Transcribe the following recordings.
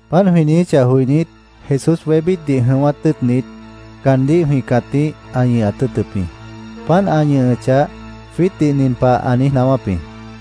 Páant jwĩ niijíchah joinít, Jesús wébítdih jʉ̃ʉ́wát tʉ́ʉtnit, caandíh jwĩ cãtíh ã ñʉhat tʉ́ʉtʉp jĩ. Páant ã ñʉhʉchah, jwiítdih nin pah ã niíj naáwáp jĩ: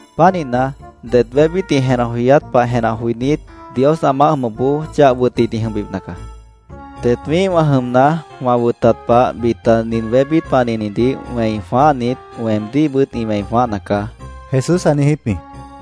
Pánihna, det wébít ĩ jenah joyát pah jenah joinít, Dios ã maáh jʉmʉpboó chah wʉtnit ĩ jʉmbipna caá. Det wĩ́ihwã jʉmna, wã wʉtat pah bita nin wébít panihnidih wẽi jwãáhnit, weemdíhbʉt ĩ wẽi jwãáhna caá, Jesús ã niijíp jĩ.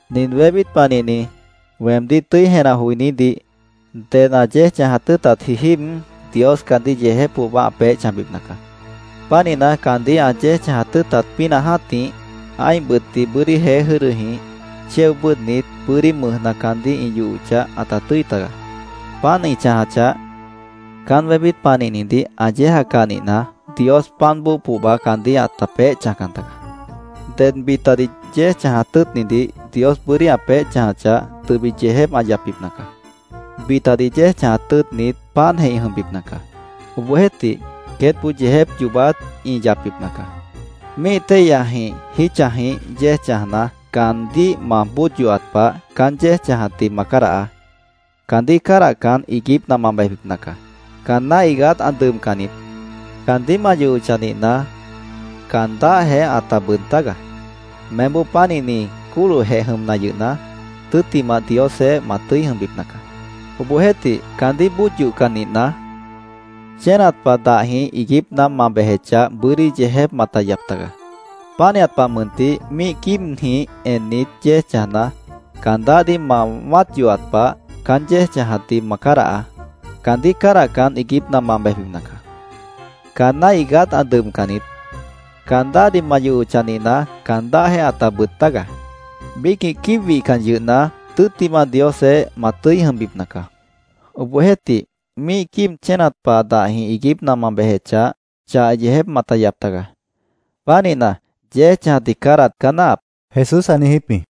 “Nin wébít panihni weemdíh tʉ́i jenah joinídih ded ã yéej chãjat tʉ́ʉtatji jíib, Dios caandíh yeejép pohba ã peéh chãjbipna caá. Pánihna, caandíh ã yéej chãjat tʉ́ʉtat pínah jã́tih, ã́ih bʉtdih bʉ́dí jeé jʉ́dʉjĩh chéo bʉ́ʉdhnit, bʉ́dí mʉjna caandíh ĩ yohochah, ãta tʉ́i taga. Páant ĩ chãjachah, caán wébít panihnidih ã yéejacah nihna, Dios páant bóo pohba caandíh ãta peéh chãjcan taga. Ded bitadih yéej chãjat tʉ́ʉtnidih Dios bʉ́dí ã peéh chãjachah, tʉbit yeejép ã yapbipna caá. Bitadih yéej chãjat tʉ́ʉtnit páantjeh ĩ jʉmbipna caá. Obohjeéhtih, queétboó yeejép yoobát ĩ yapbipna caá. “Míih téihyajĩh, jítchajĩh yéej chãjna, caandíh ma bóod yohat pah, caán yéej chãjatdih ma cádahaá. Caandíh cádahcan, iiguípna ma bejbipna caá. Caanná iigát ã dʉbcan niít. Caandíh ma yohochah nihna, caan dáhjeh ãta bʉʉd tágaá. Meémboó pánihni cólohjeh jʉmna yʉhna, tʉ́ttimah Diosjeéh ma tʉ́i jʉmbipna caá. Obohjeéhtih, caandíh bóod yohcan nihna, chénat pah dahjĩh iiguípna ma bejechah, bʉ́dí yeejép mata yap tagaá. Pánihat pah mʉntih, míih quíibjĩh ennit, yéej chãjna, caan dáhdih ma wã́at yohat pah, caán yéej chãjatdih ma cádahaá. Caandíh cádahcan, iiguípna ma bejbipna caá. Caanná iigát ã dʉbcan niít. Caan dáhdih ma yohochah nihna, caan dáhjeh ãta bʉʉd tágaá. Biícjĩh quíib wihcan yʉhna, tʉ́ttimah Diosjeéh ma tʉ́i jʉmbipna caá. Obohjeéhtih, míih quíib chénat pah dahjĩh iiguípna ma bejechah, chah yeejép mata yap tagaá. Pánihna, yéej chãjatdih cádahat caá náahap”, Jesús ã niijíp jĩ.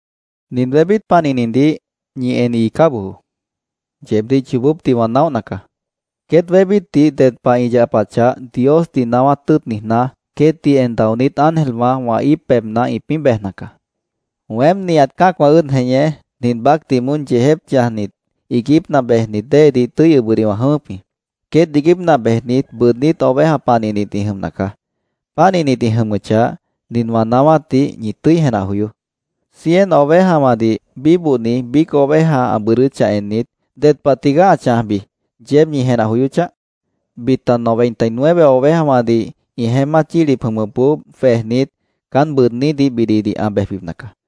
“Nin wébít panihnidih ñi en iicá bojoó. Yeebdíh yoobópdih wã naóhna caá. Queét wébítdih ded pah ĩ yapachah Diosdih naáwát tʉ́ʉt niijná, queétdih en daonít ángelwã wã íip pebhna ĩpĩ́ bejna caá. Weém nihat cã́acwã ʉ́ʉd jeñé, nin baácdih moón yeejép chãjnit, iiguípna bejnit déedih tʉ́i ʉbʉdih wã jʉ̃ʉ́wʉ́p jĩ. Queét iiguípna bejnit, bʉʉdnít ovejawã panihnit ĩ jʉmna caá. Pánihnit ĩ jʉmʉchah, nin wã naáwátdih ñi tʉ́i jenah joyoó: Cien ovejawãdih bíbohni biíc oveja ã bʉʉdʉ́chah ennit, ¿ded pah tigaá ã chãjbi, yeéb ñi jenah joyóchah? Bita noventa y nueve ovejawãdih ĩ jeémát yílip jʉmʉpboó jwejnit, caán bʉʉdnídih bididih ã bejbipna caá.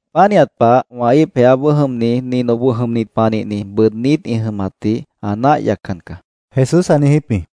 Pánihat pah wã íip jeáboó jʉmni nin oboh jʉmni panihni bʉʉdnít ĩ jʉmatdih ã náah yaccan caá”, Jesús ã niijíp jĩ.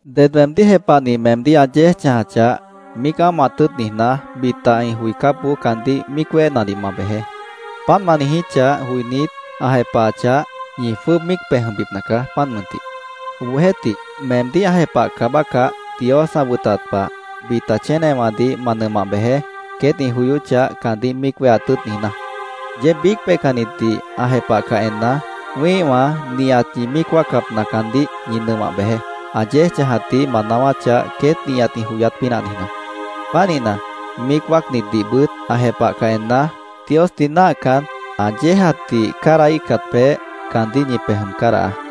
“Ded weemdíh jepahni meemdíh ã yéej chãjachah, míic ámohat tʉ́ʉt niijná, bita ĩ joicápboó caandíh míic wéhenadih ma bejeé. Páant ma niijíchah joinít, ã jepahachah, ñi jwʉ́ʉb míic pej jʉmbipna caá, páant mʉntih. Obohjeéhtih, meemdíh ã jepahcah bácah, Dios ã wʉtat pah, bita chénewãdih ma nʉmah bejeé, queét ĩ joyóchah, caandíh míic wéheat tʉ́ʉt niijná. Yeéb biíc peihcannitdih ã jepahcah enna, wĩ́ihwã nihat ñi míic wáacapna caandíh ñi nʉmah bejeé, ã yéej chãjatdih ma naáwáchah, queét nihat ĩ joyát pínah niijná. Pánihna, míic wáacnitdihbʉt ã jepahcah enna, Diosdih náahcan, ã yéejatdih cádahíhcat peéh, caandíh ñi pej jʉm cádahaá.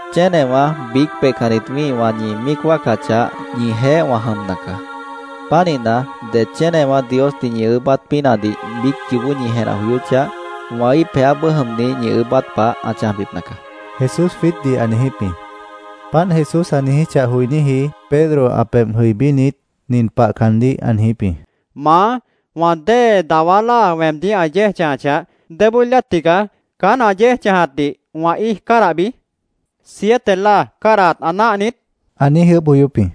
“Chénewã, biíc peihcannit wĩ́ihwã ñi míic wáacachah, ñijeéh wã jʉmna caá. Pánihna, det chénewã Diosdih ñi ʉʉ́bát pínahdih biíc yoobó ñi jenah joyóchah, wã íip jeáboó jʉmni ñi ʉʉ́bát pah ã chãjbipna caá”, Jesús jwiítdih ã niijíp jĩ. Páant Jesús ã niijíchah joiníji Pedro ã pebh jʉibínit, nin pah caandíh ã niijíp jĩ: —¿Maá, wã dée dawá láa weemdíh ã yéej chãjachah, débói láa tigaá caán ã yéej chãjatdih wã íij cádahbi? ¿Siete láa cádahat ã náah niít? ã niíj ʉʉ́bh joyóp jĩ.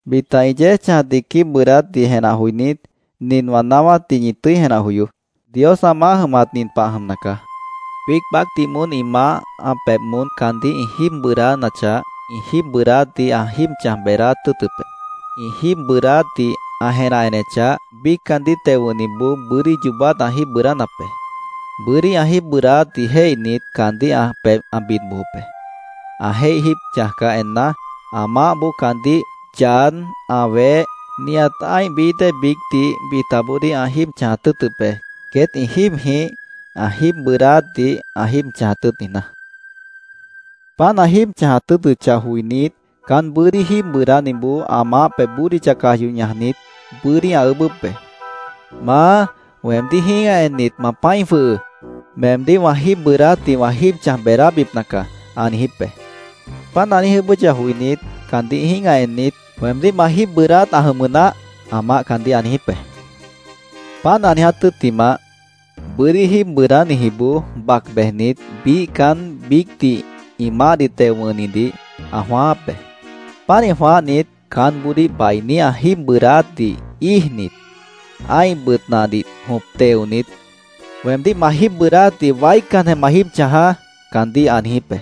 “Bita ĩ yéej chãjatdih quíib bʉʉdátdih jenah joinít, nin wã naáwátdih ñi tʉ́i jenah joyoó: Dios ã maáh jʉmat nin pah ã jʉmna caá. Biíc baácdih moón ĩ maáh ã pebh moón caandíh ĩ jíib bʉʉdánachah, ĩ jíib bʉʉdáátdih ã jíib chãj beedáát tʉ́ʉtʉp be. Ĩ jíib bʉʉdáátdih ã jenah enechah, biíc caandíh teo wʉ̃hniboó bʉ́dí yoobát ã jíib bʉʉdánap be. Bʉ́dí ã jíib bʉʉdáátdih jéihnit, caandíh ã pebh ã bid bojop be. Ã jéih jíib chãjcah enna, ã maáhboó caandíh, yad, ã weh, nihat ã́ih bií dée biícdih bitaboodíh ã jíib chãjat tʉ́ʉtʉp be, queét ĩ jíibjĩh ã jíib bʉʉdáátdih ã jíib chãjat tʉ́ʉt niijná. Páant ã jíib chãjat tʉ́ʉtʉchah joinít, caán bʉ́dí jíib bʉʉdániboó ã maáh pebh bódicha caj yoh ñajnit, bʉ́dí ã ʉʉ́bʉ́p be. ‘Maá, weemdíh jĩ́gah ennit, ma pã́i jwʉhʉʉ́. Meemdíh wã jíib bʉʉdáátdih wã jíib chãj beedábipna caá’, ã niijíp be. Páant ã niíj ʉʉ́bʉ́chah joinít, caandíh jĩ́gah ennit, ‘Weemdíh ma jíib bʉʉdáát ã jʉmʉ naáh’, ã maáh caandíh ã niijíp be. “Páant ã niiját tʉ́ttimah, bʉ́dí jíib bʉʉdánijiboó bac bejnit, biíh caán biícdih ĩ maáhdih teo wʉ̃hnidih ã jwãááp be. Pánih jwãáhnit, caánboodíh bainí ã jíib bʉʉdáátdih íijnit, ã́ih bʉt nahdih jõp teonit, ‘¡Weemdíh ma jíib bʉʉdáátdih waícanjeh ma jíib chãjaá!’ caandíh ã niijíp be.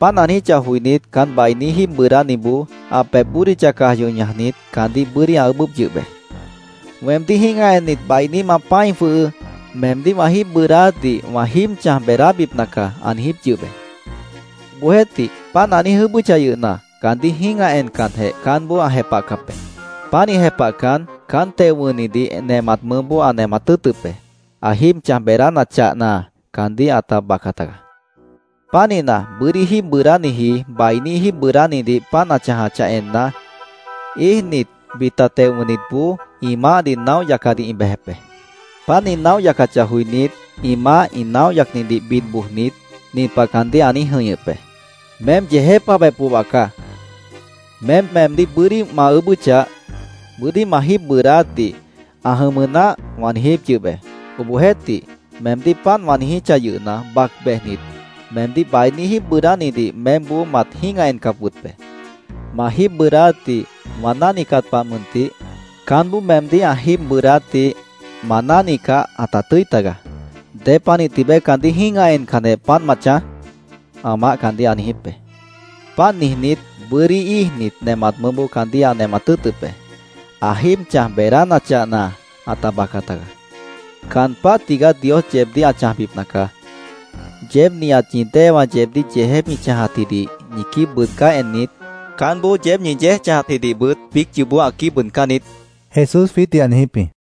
Páant ã niijíchah joinít, caán bainí jíib bʉʉdániboó ã pebh bódicha caj yoh ñajnit, caandíh bʉ́dí ã ʉʉ́bʉ́p yʉh be. ‘Weemdíh jĩ́gah ennit, bainí ma pã́i jwʉhʉʉ́. Meemdíh wã jíib bʉʉdáátdih wã jíib chãj beedábipna caá’, ã niijíp yʉh be. Obohjeéhtih, páant ã niíj ʉʉ́bʉ́chah yʉhna, caandíh jĩ́gah encanjeh, caánboó ã jepahcap be. Pánih jepahcan, caán teo wʉ̃hnidih nemat mʉʉ́boó ã nemat tʉ́ʉtʉp be. Ã jíib chãj beedánachahna, caandíh ãta baca tagaá. “Pánihna, bʉ́dí jíib bʉʉdániji bainí jíib bʉʉdánidih páant ã chãjachah enna, íijnit, bita teo wʉ̃hnitboó ĩ maáhdih naóh yacadih ĩ bejep be. Páant ĩ naóh yacachah joinít, ĩ maáh ĩ naóh yacnidih bid bojnit, nin pah caandíh ã niíj jʉ̃ihñʉp be: ‘¡Meém yeejép pohba caá! Meém weemdíh bʉ́dí ma ʉʉ́bʉ́chah, “Bʉ́dí ma jíib bʉʉdáátdih ã jʉmʉ naáh”, wã niijíp yʉh be. Obohjeéhtih, meemdíh páant wã niijíchah yʉhna, bac bejnit, meemdíh bainí jíib bʉʉdánidih meémboó mat jĩ́gah encap wʉt be. Ma jíib bʉʉdáátdih wã náhnicat pah mʉntih, caánboó meemdíh ã jíib bʉʉdáátdih ma náhnicah, ãta tʉ́i tagaá. ¿Dépanih tibeé caandíh jĩ́gah encanjeh, páant ma chãj?’ ã maáh caandíh ã niijíp be. Páant niijnít, bʉ́dí íijnit, nemat mʉʉ́boó caandíh ã nemat tʉ́ʉtʉp be. Ã jíib chãj beedánachahna, ãta baca tagaá. “Caan páh tigaá Dios yeebdíh ã chãjbipna caá. Yeéb nihat ñi déewã yeebdíh yeejép ĩ chãjatjidih ñi quíib bʉʉdcáh ennit, caánboó yeéb ñi yéej chãjatjidihbʉt biíc yoobó ã quíib bʉʉdcán niít”, Jesús jwiítdih ã niijíp jĩ.